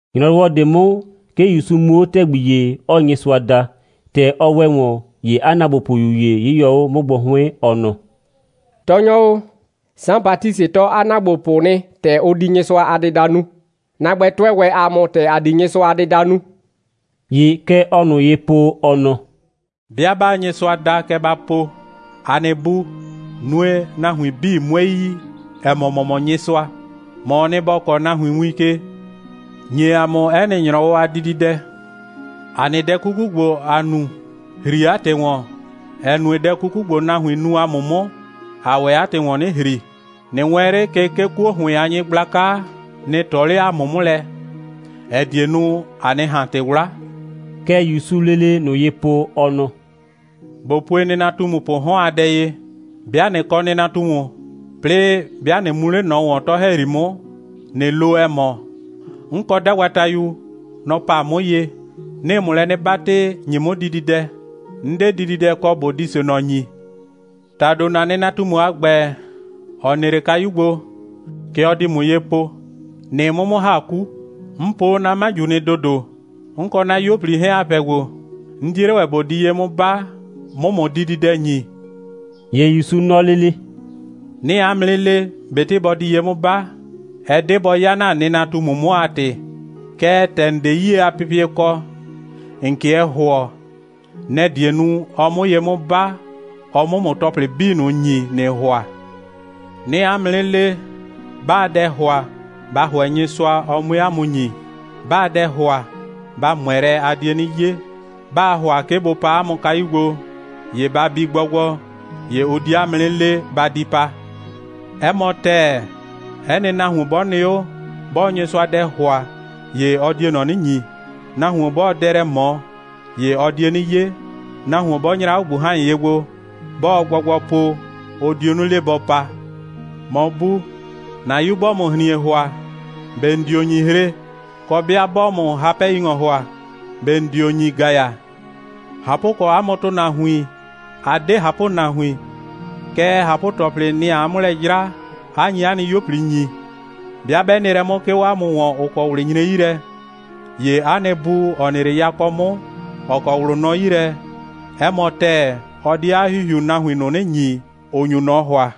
‑Nyrɔwɔ ꞊de 'mʋ, 'ke ‑Yusu mu 'o ‑tɛgbi ‑ye, 'ɔɔ Nyɩsʋa da. ‑Tɛ ɔ ‑wɛ ‑wɔn, ‑ye 'a ‑naagbopʋyu ‑ye 'yɩyɔ 'o 'mʋ gbo 'hʋɩn, ɔ nɔ: «Tɔɔnyɔ o, Saan Batisɩ tɔɔ 'a ‑naagbopʋ nɩ, ‑tɛ ʋ di Nyɩsʋa a dɩda nu. ‑Na ‑gbɛ, tʋɛ ‑wɛ ‑a mʋ, ‑tɛ ‑a di Nyɩsʋa a dɩda nu.» ‑Ye kɛ ɔɔ ꞊nʋ ye po, ɔ nɔ: «'Bɩa 'baa Nyɩsʋa da, kɛ ba po: ‑A nɩ Bu, nue, nahuin 'bii 'mue yi, ‑ɛ mɔ, ‑mɔ mɔ Nyɩsʋa. ‑Mɔɔ nɩ, ‑bɔ kɔɔ nahuin win ke. ‑Nye ‑a mʋ 'ɛ nɩ ‑nyrɔwɔ a dididɛ. ‑A nɩ dɛ 'kuku ‑gbo, ‑a nu, ‑hri 'a ‑tɩ ‑wɔn, ‑ɛ nue, dɛ 'kuku ‑gbo, nahuin nu ‑a mʋ 'mʋ, ‑aa ‑wɛ 'a ‑tɩ ‑wɔn 'nɩ ‑hri. ꞊Nɩ wɛɛn 'le ke, 'kuo ‑hʋɩn a nyɩgblaka nɩ ꞊tɔ 'le ‑a mʋ 'mʋ lɛ, ‑ɛ die nu, ‑a 'nɩ ꞊han ‑tɩ 'wla.» Kɛ ‑Yusuu lele ꞊nʋ ye po, ɔ nɔ: «꞊Bo pue nɩnatumupʋʋ 'hɔn a dɛ ye: 'Bɩa ꞊nɩ kɔ nɩnatumu, 'plɩɩ 'bɩa ꞊nɩ mu 'le ꞊nɔ ‑wɔn, 'tɔ‑hɛyri 'mʋ, ꞊nɩ lo, ‑ɛ mɔ: 'N kɔ 'dagbatayu. Nɔ‑ pa 'mʋ ye. 'Nɩɩ ‑mʋ lɛ 'nɩ 'batɩ, ‑nye 'mʋ dididɛ. 'N 'de dididɛ kɔ, ꞊bo di ꞊se ꞊nɔ ‑nyi. ‑Tado, ‑na nɩnatumu a ‑gbɛ, ‑ɔ nɩ 'le 'a kayu gbo, kɛ ɔ di ‑mʋ ye po: ‑Nɩɩ 'mʋ 'mʋ ‑ha 'ku. 'N po 'o 'na 'maju nɩ ‑dodo. 'N kɔ 'na 'yuo꞊pli 'hɛɛn, ‑a pɛ gbo. 'N 'die 'le ‑wɛ ꞊bo di ye 'mʋ 'ba, 'mʋ ‑mʋ dididɛ ‑nyi.» ‑Ye ‑Yusu nɔ lele: «'Nɩɩ 'a mʋ 'nɩ le, ꞊betɩ bɔ di ye 'mʋ 'ba, ɛ 'de bɔ 'ya ‑na nɩnatumu 'mʋ a ‑tɩ. Kɛɛ, ‑tɛ ‑n 'de 'yie a pɩpɩɛ kɔ, ‑n 'kɩɛ ‑hʋɔ, nɛ‑ die nu, 'ɔ 'mʋ ye 'mʋ 'ba, ɔ 'mʋ ‑mʋ ‑tɔplɩ 'bii ꞊nʋ ‑nyi, ‑nɩɩ ‑hʋa. 'Nɩɩ 'a mʋ 'nɩ le, 'baa dɛ ‑hʋa, ba ‑hʋɛ Nyɩsʋa, ɔ 'mue 'a mʋ ‑nyi. 'Baa dɛ ‑hʋa, ba ꞊mʋɛ lɛ, a die 'nɩ 'ye. 'Baa ‑hʋa 'ke bʋ paa 'a mʋ kayu gbo, ‑ye ba bi gbɔgbɔ, ‑ye ʋ di 'a mʋ 'nɩ le: Ba di pa. 'Ɛ mɔ ‑tɛɛ, 'ɛ nɩ nahuon 'bɔ nɩ 'o, 'bɔɔ Nyɩsʋa dɛ ‑hʋa, ‑ye ɔ die ꞊nɔ 'nɩ ‑nyi. Nahuon 'bɔɔ dɛ lɛ ꞊mɔ, ‑ye ɔ die 'nɩ 'ye. Nahuon 'bɔ nyra 'o ꞊gbuhan.ye gbo, 'bɔɔ gbɔgbɔ po, ʋ dio 'nɩ le, bɔ pa. ‑Mɔ bu, ‑na 'yu 'bɔɔ ‑mʋ ‑hrin.e ‑hʋa, ꞊be ‑n dio ‑nyi hre, kɔ, 'bɩa 'bɔɔ ‑mʋ hapɛ'yi‑ŋɔ ‑hʋa, ꞊be ‑n dio ‑nyi ‑gaya. ꞊Hapʋkɔ, 'a mʋ ‑tʋnahuin, 'a 'de ꞊hapʋnahuin, kɛɛ, ꞊hapʋ‑tɔplɩ, nɩ‑ aa 'mʋ lɛ 'jra, 'a nyi 'a nɩ 'yuo꞊pli ‑nyi. 'Bɩa 'bɛ nɩ lɛ 'mʋ, 'ke 'o 'a mʋ ‑wɔn, ‑ʋ kɔ ꞊wlɩ nyre 'yi lɛ, ‑ye 'a nɩ Bu, ‑ɔ nɩ 'le yakɔ 'mʋ, ‑ɔ kɔ ꞊wlʋ nɔ 'yi lɛ, 'ɛ mɔ ‑tɛɛ, ɔ di 'a ‑Hihiu nahuin ꞊nʋ 'nɩ ‑nyi, ‑ʋ nyu ꞊nɔ ‑hʋa.»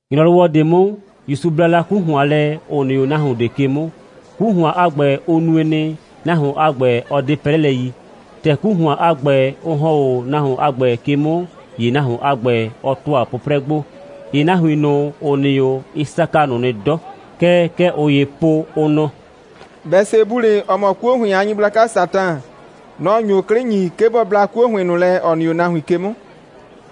‑Nyrɔwɔ ꞊de 'mʋ, ‑Yusu bla la 'ku ‑hʋan lɛ, ‑ʋ nɩ 'o nahuon ꞊de ke 'mʋ. 'Ku ‑hʋan a ‑gbɛ, ʋ nue nɩ, nahuon a ‑gbɛ 'ɔ 'de 'prɛlɛ yi. ‑Tɛ 'ku ‑hʋan a ‑gbɛ, ʋ ‑hɔn 'o nahuon a ‑gbɛ ke 'mʋ, ‑ye nahuon a ‑gbɛ, ɔ ‑tʋa 'pʋprɛ gbo. ‑Ye nahuin ꞊nʋ, ‑ʋ nɩ 'o, ɩ saka ꞊nʋ nɩ 'dɔ. Kɛɛ, kɛ ꞊ʋ ‑yee po, ʋ nɔ: «Bɛsebulɩ, ‑ɔ mɔ 'kuo ‑hʋɩn a nyɩgblaka Satan, nɔ‑ nyo 'klɩ ‑nyi, 'ke bɔ bla 'kuo ‑hʋɩn ꞊nʋ lɛ, ‑ɔ nɩ 'o nahuin ke 'mʋ.»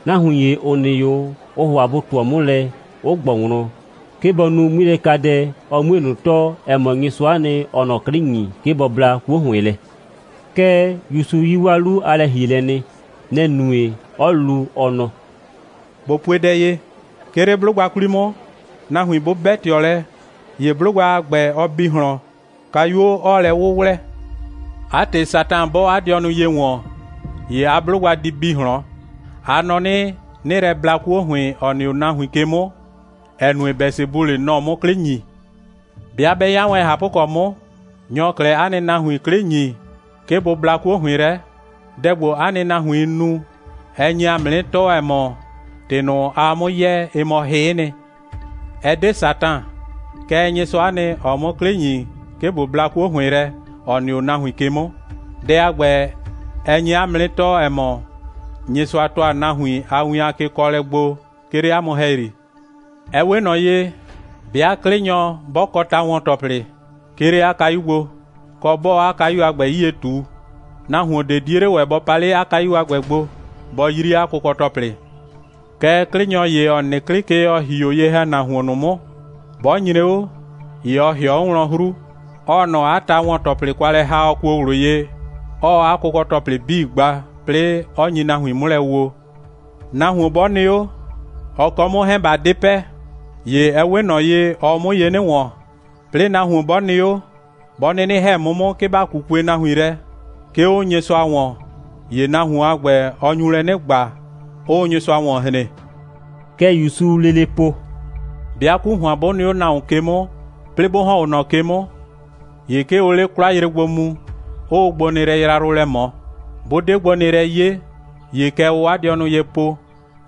Nahuin ‑ye, ‑ʋ nɩ 'o, ʋʋ ‑hʋa bʋ ꞊tʋɔ 'mʋ lɛ, 'ʋ ꞊gbɔ wlɔn, 'ke bɔ nu 'ŋmilɛkadɛ, ɔ 'mue ꞊nʋ tɔɔ, ‑ɛ mɔ, Nyɩsʋa'a nɩ, ‑ɔɔ ꞊nɔ 'klɩ ‑nyi, 'ke bɔ bla 'kuo ‑hʋɩn lɛ. Kɛɛ, ‑Yusu yi 'waa 'lu a lɛ‑hielɛ nɩ. Nɛ‑ nue, 'ɔ lu, ɔ nɔ: «꞊Bo pue dɛ ye: 'Ke 'le 'blʋgba 'kwli 'mʋ, nahuin 'bʋ 'bɛ ꞊tɩɔ lɛ, ‑ye 'blʋgba a ‑gbɛ, ɔ bi ꞊hlɔn, kayuo 'ɔɔ lɛ 'wʋwlɛ. 'A ‑tɩ, Satan 'bɔɔ 'a dɩɔnʋ ye ‑wɔn, ‑ye 'a 'blʋgba di bi ꞊hlɔn. A nɔ 'nɩ, 'nɩɩ lɛ bla 'kuo ‑hʋɩn, ‑ɔ nɩ 'o nahuin ke 'mʋ, ‑ɛ nue, Bɛsebulɩ, nɔ‑ɔ 'mʋ 'klɩ ‑nyi. 'Bɩa 'bɛ 'ya wɛn ꞊hapʋkɔ 'mʋ, nyɔ‑ɔ 'klɛɛ 'a nɩ nahuin 'klɩ ‑nyi 'le, 'ke bʋ bla 'kuo ‑hʋɩn lɛ? Dɛ ‑gbo, 'a nɩ nahuiin nu, ɛ nye ‑a mʋ 'nɩ tɔɔ, ‑ɛ mɔ, ‑tɩ ꞊nʋ, aa 'mʋ yɛɛ, ɩ mɔ hɩ'ɩ nɩ. Ɛ 'de Satan, kɛɛ, Nyɩsʋa'a nɩ, ‑ɔɔ 'mʋ 'klɩ ‑nyi, 'ke ꞊bo bla 'kuo ‑hʋɩn lɛ, ‑ɔ nɩ 'o nahuin ke 'mʋ. Dɛ a ‑gbɛ, ɛ nye 'a mʋ 'nɩ tɔɔ, ‑ɛ mɔ, Nyɩsʋa ‑tʋa nahuin a win a kekɔɔlɛ gbo, 'ke 'le 'a mʋ ‑hɛyri. Ɛ 'we ꞊nɔ ye, 'bɩa 'klɩnyɔ, 'bɔ kɔ ta‑wɔn‑tɔplɩ, 'ke 'le 'a kayu gbo, kɔ, 'bɔɔ 'a kayu a ‑gbɛ 'yie ꞊tu, nahuon ꞊de 'die 'le ‑wɛ bɔ pa 'le 'a kayu a ‑gbɛ gbo, bɔ 'yri 'a kʋkɔ‑tɔplɩ. Kɛɛ, 'klɩnyɔ ‑ye, ‑ɔ nɩ 'klɩ ke, ‑ɔ ‑hi 'o ye‑hɛnahuon ꞊nʋ 'mʋ, 'bɔ nyre 'o, ‑ye ɔ ‑hɩɔ 'o wlɔn 'hru, 'ɔɔ ꞊nɔ 'a ta‑wɔn‑tɔplɩ kwa lɛ ‑ha, ɔ kuo ꞊wlʋ ye, 'ɔɔ 'a kʋkɔ‑tɔplɩ 'bii gba, 'plɩɩ 'ɔ nyi nahuin 'mʋ lɛ woo. Nahuon 'bɔ nɩ 'o, ɔ kɔ 'mʋ 'hɛɛn, ꞊ba 'de pɛ, ‑ye ɛ 'we ꞊nɔ ye, ɔɔ 'mʋ ye 'nɩ ‑wɔn. 'Plɩɩ nahuon 'bɔ nɩ 'o, 'bɔ 'nɩnɩ ‑hɛ 'mʋ 'mʋ, 'ke ‑ba 'kukue nahuin lɛ, 'ke 'o Nyɩsʋa ‑wɔn, ‑ye nahuon a ‑gbɛ, ɔ nyu lɛ 'nɩ ‑gba, 'ʋʋ Nyɩsʋa ‑wɔn hren.» Kɛ ‑Yusuu lele po: «'Bɩa 'ku ‑hʋan, 'bʋ nɩ 'o nahuon ke 'mʋ, 'plɩɩ 'bʋ ‑hɔn 'o ꞊nɔ ke 'mʋ, ‑ye 'ke ʋʋ 'le 'kwlayre gbo mu, 'ʋʋ gbonɩɩlɛ yrayrʋ lɛ ꞊mɔ. 'Bʋ 'de gbonɩɩlɛ 'ye, ‑ye kɛ ʋʋ 'a dɩɔnʋ ye po: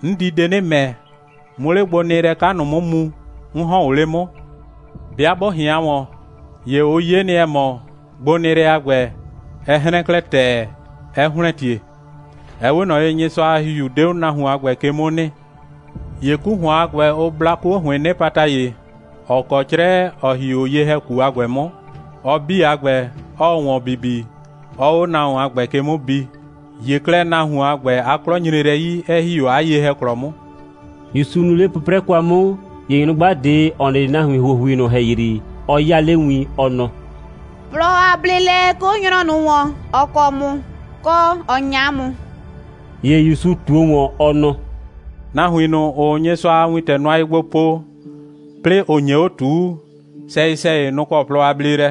'N di de 'nɩ ‑mɛ, 'mʋ 'le gbonɩɩlɛ 'ka ꞊nʋ 'mʋ mu, 'n ‑hɔn o 'le 'mʋ. 'Bɩa 'bʋ ꞊hɩan ‑wɔn, ‑ye ʋ 'ye nɩ, ‑ɛ mɔ, gbonɩɩlɛ a ‑gbɛ, ɛ 'hrɛn klɛ ‑tɛɛ, 'ɛ ‑hlɛntie. (Ɛ 'we ꞊nɔ ye, Nyɩsʋa a ‑Hihiu 'de 'o nahuon a ‑gbɛ ke 'mʋ nɩ.) ‑Ye 'ku ‑hʋan a ‑gbɛ, ʋ bla 'kuo ‑hʋɩɩn 'nɩpata ‑ye, ‑ɔ kɔ 'crɛ, 'ɔ ‑hi 'o ye‑hɛku a ‑gbɛ 'mʋ, ɔ 'bii a ‑gbɛ, 'ɔɔ ‑wɔn bibi, 'ɔɔ 'o nahuon a ‑gbɛ ke 'mʋ bi. ‑Ye 'klɛɛ, nahuon a ‑gbɛ, 'a 'klɔ nyre lɛ 'yi, 'ɛ ‑hi 'o 'a ye‑hɛklɔ 'mʋ.» ‑Yusu nɩ 'le 'pʋprɛ kwa 'mʋ, ‑ye nyrʋgba ꞊de, ‑ɔ nɩ 'le nahuin ‑huohui ꞊nʋ ‑hɛyri, ɔ 'yaa 'le win, ɔ nɔ: «Plɔ a bleelɛ 'ke 'o nyrɔ ꞊nʋ ‑wɔn, ‑ɔ kɔ ‑mʋ, kɔ, ‑ɔ 'nya ‑mʋ!» ‑Ye ‑Yusu ꞊tuo ‑wɔn, ɔ nɔ: «Nahuin ꞊nʋ, ‑ʋʋ Nyɩsʋa a wintɛ nʋa ye gbo po, 'plɩɩ ‑ʋ nye 'o ꞊tuu, sɛyɩ‑sɛyɩ, nʋ‑ kɔ plɔ a bleelɛ.»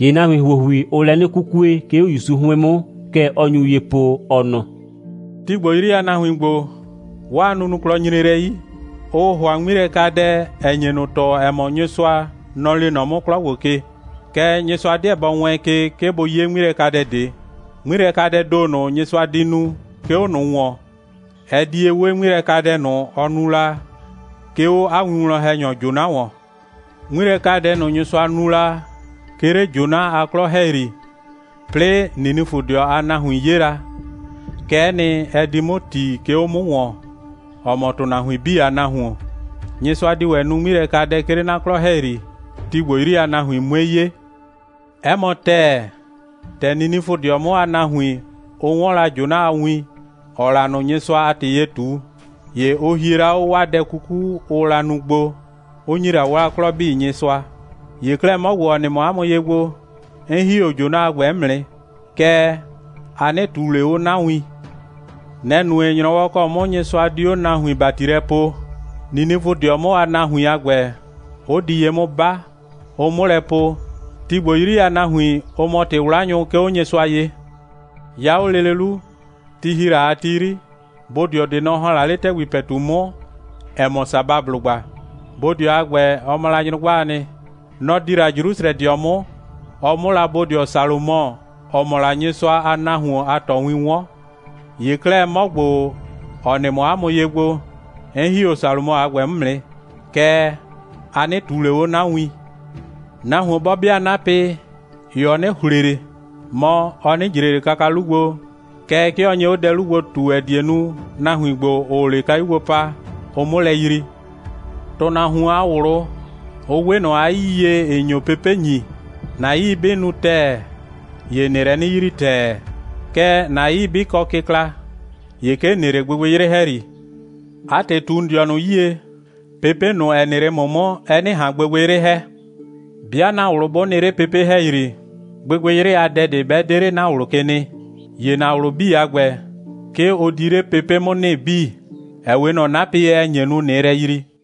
‑Ye nahuin ‑huohui, ʋʋ lɛ 'nɩ 'kukue, 'ke 'o ‑Yusu 'hʋɩn 'mʋ. Kɛ ɔ nyu ye po, ɔ nɔ: «Ti ‑gbo 'yri a nahuin ‑gbo, 'waa nunuklɔ nyre lɛ 'yi. Ʋʋ ‑hʋa 'ŋmilɛkadɛ, ‑ɛ nye ꞊nʋ tɔɔ, ‑ɛ mɔ, Nyɩsʋa, nɔ‑ lee nɔ 'mʋ 'klɔ ‑gbo ke. Kɛɛ, Nyɩsʋa 'deɛ bɔ wɛɛn ke, 'ke bʋ 'ye 'ŋmilɛkadɛ ꞊de. 'Ŋmilɛkadɛɛ ‑do ꞊nʋ, Nyɩsʋa di nu, 'ke 'o ꞊nʋ ‑wɔn, ɛ di ye 'we 'ŋmilɛkadɛ ꞊nʋ, ɔ nu la, 'ke 'o 'a winwlɔn‑hɛnyɔ Jona ‑wɔn. 'Ŋmilɛkadɛ ꞊nʋ, Nyɩsʋa nu la, 'ke 'le Jona a 'klɔ ‑hɛyri, 'plɩɩ Ninifʋdɩɔ a nahuin 'ye la, kɛ'ɛ nɩ, ɛ di 'mʋ ‑ti, 'ke 'o 'mʋ ‑wɔn, ‑ɔ mɔ ‑tʋnahuin 'bii a Nahuon. Nyɩsʋa di ‑wɛ nu 'ŋmilɛkadɛ, 'ke 'le 'na 'klɔ ‑hɛyri, ti ‑gbo 'yri a nahuin 'mue 'ye. 'Ɛ mɔ ‑tɛɛ, ‑tɛ Ninifʋdɩɔ 'mʋ a nahuin, ʋ 'wɔn la Jona a win, ‑ɔɔ la ꞊nʋ Nyɩsʋa a ‑tɩ ye ꞊tu, ‑ye ʋ hie la 'o 'waa dɛ 'kuku, ʋʋ la nu gbo, 'ʋ ‑nyi la 'waa 'klɔ 'bii Nyɩsʋa. ‑Ye 'klɛɛ, 'mɔ ‑gbo, ‑ɔ nɩ mɔ 'a mʋ ye gbo, 'n ‑hi 'o Jona a ‑gbɛ 'mʋ nɩ, kɛɛ, a 'nɩ ꞊tuu ꞊le 'o 'na win. Nɛ‑ nue, ‑nyrɔwɔ ‑kɔ 'mʋ Nyɩsʋa di 'o nahuin ‑bati lɛ poo, Ninifʋdɩɔ 'mʋ a nahuin a ‑gbɛ 'ʋ di ye 'mʋ 'ba, ʋ 'mʋ lɛ po, ti ‑gbo 'yri a nahuin, ʋ mɔ ‑tɩ'wlanyʋ, 'ke 'o Nyɩsʋa ye. 'Ya 'o lele 'lu, ti ‑hi la a ti 'yri, bodɩɔ ꞊de, nɔ‑ ‑hɔn la 'le ‑tɛgbi ‑pɛtu 'mʋ, ‑ɛ mɔ Sabablʋgba. Bodɩɔ a ‑gbɛ, ɔ mɔ la nyrʋgbaa nɩ. Nɔ‑ di la Jrusrɛdɩɔ 'mʋ, ɔ 'mʋ la bodɩɔ Salomɔ, ‑ɔ mɔ la Nyɩsʋa a nahuon a ꞊tɔwin 'wɔn. ‑Ye 'klɛɛ, 'mɔ ‑gbo, ‑ɔ nɩ mɔ 'a mʋ ye gbo, 'n ‑hi 'o Salomɔ a ‑gbɛ 'mʋ nɩ. Kɛɛ, a 'nɩ ꞊tuu ꞊le 'o 'na win. Nahuon 'bɔ 'bɩa 'napɩ, ‑ye ɔ 'nɩ ‑hle ꞊le, mɔ, ɔ 'nɩ ꞊jre ꞊le kaka 'lu gbo, kɛɛ, 'ke ɔ nye 'o dɛ 'lu gbo ꞊tu, ‑ɛ die nu, nahuin ‑gbo, ‑ʋʋ 'le kayu gbo pa, ʋ 'mʋ lɛ yrii. ‑Tʋnahuon a ꞊wlʋ, ʋ 'we ꞊nɔ 'a 'yii ye, ‑ɩ nyo pepe' ‑nyi. ‑Na 'yii 'bɩ nu ‑tɛɛ, ‑ye ‑nɩɩ lɛ 'nɩ yrii ‑tɛɛ. Kɛɛ, ‑na 'yii 'bɩ kɔ kɩkla, ‑ye 'ke ‑n nɩ 'le gbɩgbɩyrɩ ‑hɛyri. 'A ‑tɩ, ꞊tu ‑n dɩɔnʋ 'yie, pepe' ꞊nʋ, ‑ɛ nɩ 'le ‑mʋ 'mʋ, ɛ 'nɩ ꞊han gbɩgbɩyrɩ ‑hɛ. 'Bɩa ‑na ꞊wlʋ 'bʋ nɩ 'le pepe' ‑hɛyri, gbɩgbɩyrɩ a dɛ ꞊de 'bɛ 'de 'le ‑na ꞊wlʋ ke nɩ, ‑ye ‑na ꞊wlʋ 'bii a ‑gbɛ, 'ke ʋ di 'le pepe' 'mʋ nɩ 'bii, ‑ɛ 'we ꞊nɔ 'napɩ ye, ‑ɛ nye nu, ꞊nɩɩ lɛ yrii.»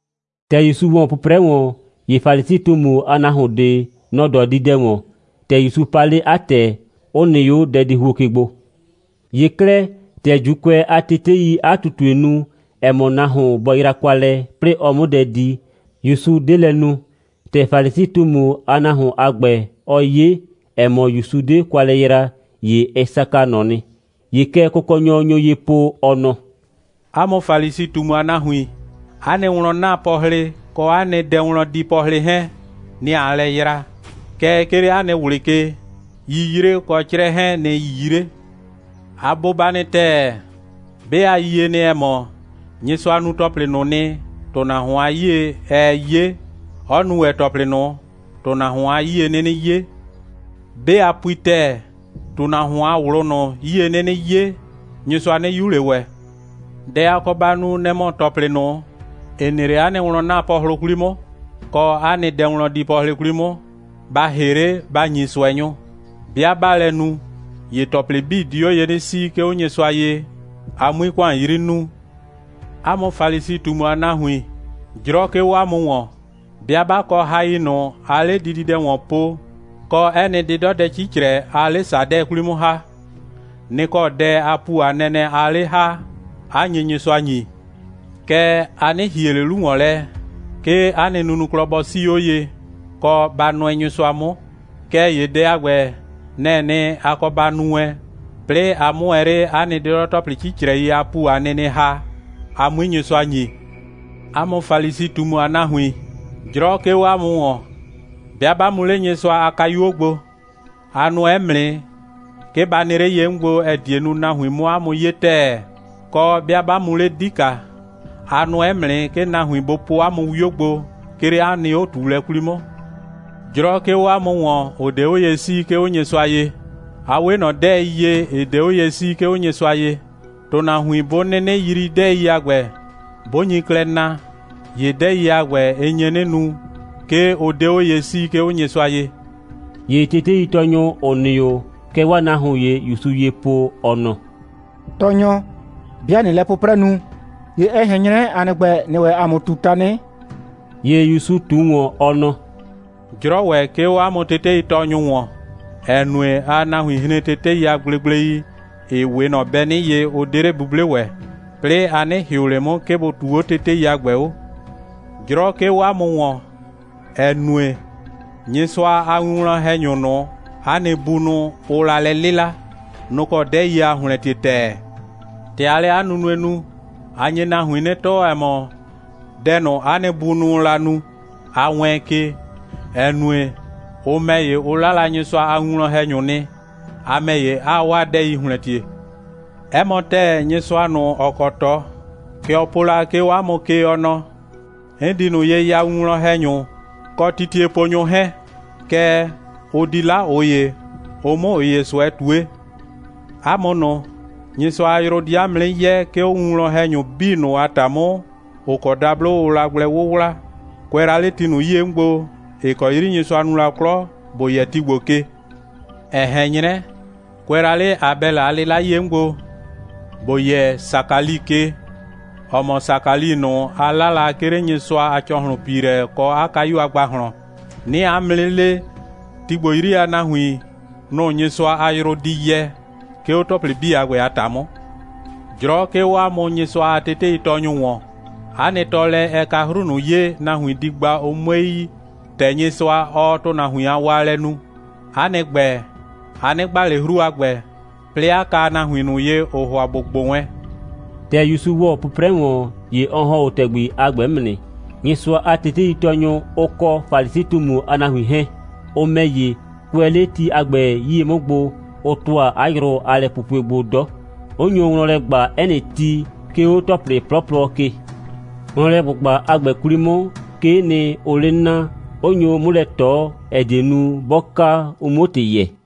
‑Tɛ ‑Yusu ‑wɔ 'pʋprɛ ‑wɔn, ‑ye Falisi꞊tumu a nahuon ꞊de, nɔ‑ dɔ dididɛ ‑wɔn. ‑Tɛ ‑Yusu pa 'le 'a ‑tɛ, 'ʋ nɩ 'o dɛdihuo ke gbo. ‑Ye 'klɛɛ, ‑tɛ ‑Juukʋɛ a teteii 'a ꞊tutue nu, ‑ɛ mɔ, nahuon bɔ yra kwa lɛ, 'plɩɩ ɔ 'mʋ dɛ di, ‑Yusu 'de lɛ nu. ‑Tɛ Falisi꞊tumu a nahuon a ‑gbɛ, ɔ 'ye, ‑ɛ mɔ, ‑Yusu 'de kwa lɛ yra, ‑ye ɛ saka ꞊nɔ nɩ. ‑Ye kɛ Kʋkɔnyɔ nyo ye po, ɔ nɔ: «'A mʋ Falisi꞊tumu a nahuin, 'a nɩ wlɔn'naapɔhlɩ kɔ dɛwlɔndiipɔhlɩ 'hɛɛn, nɩ‑ aa lɛ yra. Kɛɛ, 'ke 'le 'a nɩ ꞊wlɩ ke, 'yiyre kɔ 'crɛ 'hɛɛn, nɩ‑ 'yii 'le. A bʋba nɩ ‑tɛɛ. 'Be a yie nɩ, ‑ɛ mɔ, Nyɩsʋa nu ‑tɔplɩ ꞊nʋ nɩ, ‑tʋnahuon a 'yie, ɛɛ 'ye, 'ɔ nu ‑wɛ ‑tɔplɩ ꞊nʋ, ‑tʋnahuon a 'yie 'nɩnɩ 'ye. 'Be a pui ‑tɛɛ, ‑tʋnahuon a ꞊wlʋ ꞊nʋ, 'yie 'nɩnɩ 'ye, Nyɩsʋa 'nɩ 'yu ꞊le ‑wɛ. Dɛ a kɔ ba nu, nɛ‑ mɔ, ‑tɔplɩ ꞊nʋ, ‑ɩ nɩ 'le 'a nɩ wlɔn'naapɔhlʋ 'kwli 'mʋ, kɔ 'a nɩ dɛwlɔndiipɔhlɩ 'kwli 'mʋ, ba ‑hɩ 'le, ba ‑nyi ꞊sʋɛnyʋ. 'Bɩa 'baa lɛ nu, ‑ye ‑tɔplɩ 'bii di 'o ye 'nɩ 'sii, 'ke 'o Nyɩsʋa ye, a 'mui ‑kʋan 'yri nuu. 'A mʋ Falisi꞊tumu a nahuin, 'jrɔ 'ke 'o 'a mʋ ‑wɔn! 'Bɩa 'ba kɔ hai ꞊nʋ, aa 'le dididɛ ‑wɔn po, kɔ 'ɛ nɩ 'dɩdɔdɛ 'cicrɛ, aa 'le ‑sadɛ 'kwli 'mʋ ‑ha, nɩ‑ kɔ dɛ a ‑pu a nɛnɛ aa 'le ‑ha, 'a nye Nyɩsʋa ‑nyi. Kɛɛ, a 'nɩ ‑hie ꞊le 'lu ‑wɔn lɛ, 'ke 'a nɩ nunuklɔ bɔ 'sii 'o ye, kɔ, ba nʋɛ Nyɩsʋa 'mʋ. Kɛɛ ‑ye dɛ a ‑gbɛ, nɛ‑ɛ nɩ, a kɔ ba nu wɛn, 'plɩɩ a 'mʋ ‑wɛ 'le 'a nɩ 'dɩdɔ‑tɔplɩ 'cicrɛi a ‑pu a nɩnɩ ‑ha, a 'mui Nyɩsʋa ‑nyi. 'A mʋ Falisi꞊tumu a nahuin, 'jrɔ 'ke 'o 'a mʋ ‑wɔn! 'Bɩa 'ba mu 'le Nyɩsʋa a kayuo gbo, a nʋɛ 'mʋ nɩ, 'ke ba nɩ 'le ye 'mʋ gbo, ‑ɛ die nu, nahuin 'mʋ 'a mʋ 'ye ‑tɛɛ. Kɔ, 'bɩa 'ba mu 'le 'dika, a nʋɛ 'mʋ nɩ, 'ke nahuin bʋ po 'a mʋ 'wio gbo, 'ke 'le 'a nɩ 'o꞊tuulɛ 'kwli 'mʋ. 'Jrɔ 'ke 'o 'a mʋ ‑wɔn, ‑ʋ 'de 'o ye 'sii, 'ke 'o Nyɩsʋa ye! A 'we ꞊nɔ 'dɛɛi ye, ‑ɩ 'de 'o ye 'sii, 'ke 'o Nyɩsʋa ye. ‑Tʋnahuin 'bʋ 'nɩnɩ yrii 'dɛɛi a ‑gbɛ, 'bʋ nyi klɛ na, ‑ye 'dɛɛi a ‑gbɛ, ɩ nye 'nɩ nu, 'ke ʋ 'de 'o ye 'sii, 'ke 'o Nyɩsʋa ye.» ‑Ye teteitɔɔnyʋ, ‑ʋ nɩ 'o, kɛ 'waa nahuon ‑ye ‑Yusu ye po, ɔ nɔ: «Tɔɔnyɔ, 'bɩa ꞊nɩɩ lɛ 'pʋprɛ nu, ‑ye ɛ ꞊hɛn 'nyrɛ, ‑a nɩ ‑gbɛ, ‑nɩɩ ‑wɛ ‑a mʋ ꞊tu tanɩ.» ‑Ye ‑Yusu ꞊tuo ‑wɔn, ɔ nɔ: «'Jrɔ ‑wɛ 'ke 'o 'a mʋ teteitɔɔnyʋ ‑wɔn, ‑ɛ nue, aa nahuin hren tetei a gblegblei, ‑ɩ 'we ꞊nɔ bɛnɩ ye, ʋ 'de 'le 'buble ‑wɛ. 'Plɩɩ a 'nɩ ‑hɩʋ ꞊le 'mʋ, 'ke bʋ ꞊tuu 'o tetei a ‑gbɛ 'o. 'Jrɔ 'ke 'o 'a mʋ ‑wɔn, ‑ɛ nue, Nyɩsʋa a winwlɔn‑hɛnyʋ ꞊nʋ, 'a nɩ bunʋ, ʋʋ la lɛ 'lɩla, nʋ‑ kɔ 'dɛɛi aa ‑hlɛntie ‑tɛɛ. ‑Tɛ aa lɛ 'a nunue nu, a nye nahuin 'nɩ tɔɔ, ‑ɛ mɔ, dɛ ꞊nʋ, 'a nɩ bunʋʋ la nu, a wɛɛn ke, ‑ɛ nue, ʋ ‑mɛ ‑ye, ʋ 'la Nyɩsʋa a winwlɔn‑hɛnyʋ nɩ, a ‑mɛ ‑ye, 'aa 'waa 'dɛɛi ‑hlɛntie. 'Ɛ mɔ ‑tɛɛ, Nyɩsʋa ꞊nʋ, ‑ɔ kɔ ꞊tɔ, kɛ ɔ po la, 'ke 'o 'a mʋ ke, ɔ nɔ: 'N di ꞊nʋ ye ya winwlɔn‑hɛnyʋ, kɔ titieponyʋ 'hɛɛn, kɛɛ, ʋ di 'la ꞊ʋ ‑ye, ʋ 'mʋ ꞊ʋ ‑ye ꞊sʋɛ ꞊tue. 'A mʋ ꞊nʋ, Nyɩsʋa a yrʋ di 'a mʋ 'nɩ yɛ, 'ke 'o winwlɔn‑hɛnyʋ 'bii ꞊nʋ a ‑ta 'mʋ, ‑ʋ kɔ dablo ʋʋ la gblɛ 'wʋwla, kʋɛ la 'le ti ꞊nʋ 'yie 'mʋ gbo, ‑ɩ kɔ 'yri Nyɩsʋa nu la 'klɔ, ‑bo yɛ ti ‑gbo ke, ‑ɛ ꞊hɛn 'nyrɛ, kʋɛ la 'le Abɛlɩ a 'lɩla 'yie 'mʋ gbo, ‑bo yɛ Sakali ke, ‑ɔ mɔ Sakali ꞊nʋ, ʋ 'la la, 'ke 'le Nyɩsʋa a ‑cɔhlʋnpiilɛ kɔ 'a kayu a ‑gbahlɔn. 'Nɩɩ 'a mʋ 'nɩ le, ti ‑gbo 'yri a nahuin, nʋ‑ Nyɩsʋa a yrʋ di yɛ, 'ke 'o ‑tɔplɩ a ‑gbɛ a ‑ta 'mʋ. 'Jrɔ 'ke 'o 'a mʋ Nyɩsʋa a teteitɔɔnyʋ ‑wɔn. 'A nɩ tɔɔlɛ, ɛ ka 'hru ꞊nʋ ye, nahuin di gba, ʋ 'mue yi, ‑tɛ Nyɩsʋa, ɔɔ ‑tʋnahuin a waalɛ nu. 'A nɩ ‑gbɛ, a 'nɩ gba ꞊le 'hru a ‑gbɛ, 'plɩɩ 'a ka nahuin ꞊nʋ ye, ‑ʋʋ ‑hʋa ‑bʋ gbʋ wɛn.» ‑Tɛ ‑Yusu ‑wɔ 'pʋprɛ ‑wɔn, ‑ye ɔ ‑hɔn 'o ‑tɛgbi a ‑gbɛ 'mʋ nɩ. Nyɩsʋa a teteitɔɔnyʋ, ʋ kɔ Falisi꞊tumu a nahuin 'hɛɛn, ʋ ‑mɛ ‑ye, kʋɛ 'le ti a ‑gbɛ 'yie 'mʋ gbo, ʋ ‑tʋa 'a yrʋ a lɛpupue gbo 'dɔ, 'ʋ nyo wlɔn lɛ ꞊gba 'ɛ nɩ ti, 'ke 'o ‑tɔplɩ 'plɔplɔ ke. Wlɔnlɛ꞊gbʋgba a ‑gbɛ 'kwli 'mʋ, 'kee nɩ, ʋʋ 'le naa, 'ʋ nyo 'mʋ lɛ ꞊tɔ, ‑ɛ die nu, 'bɔ ka, ʋ 'muo ‑tɩ yɛɛ.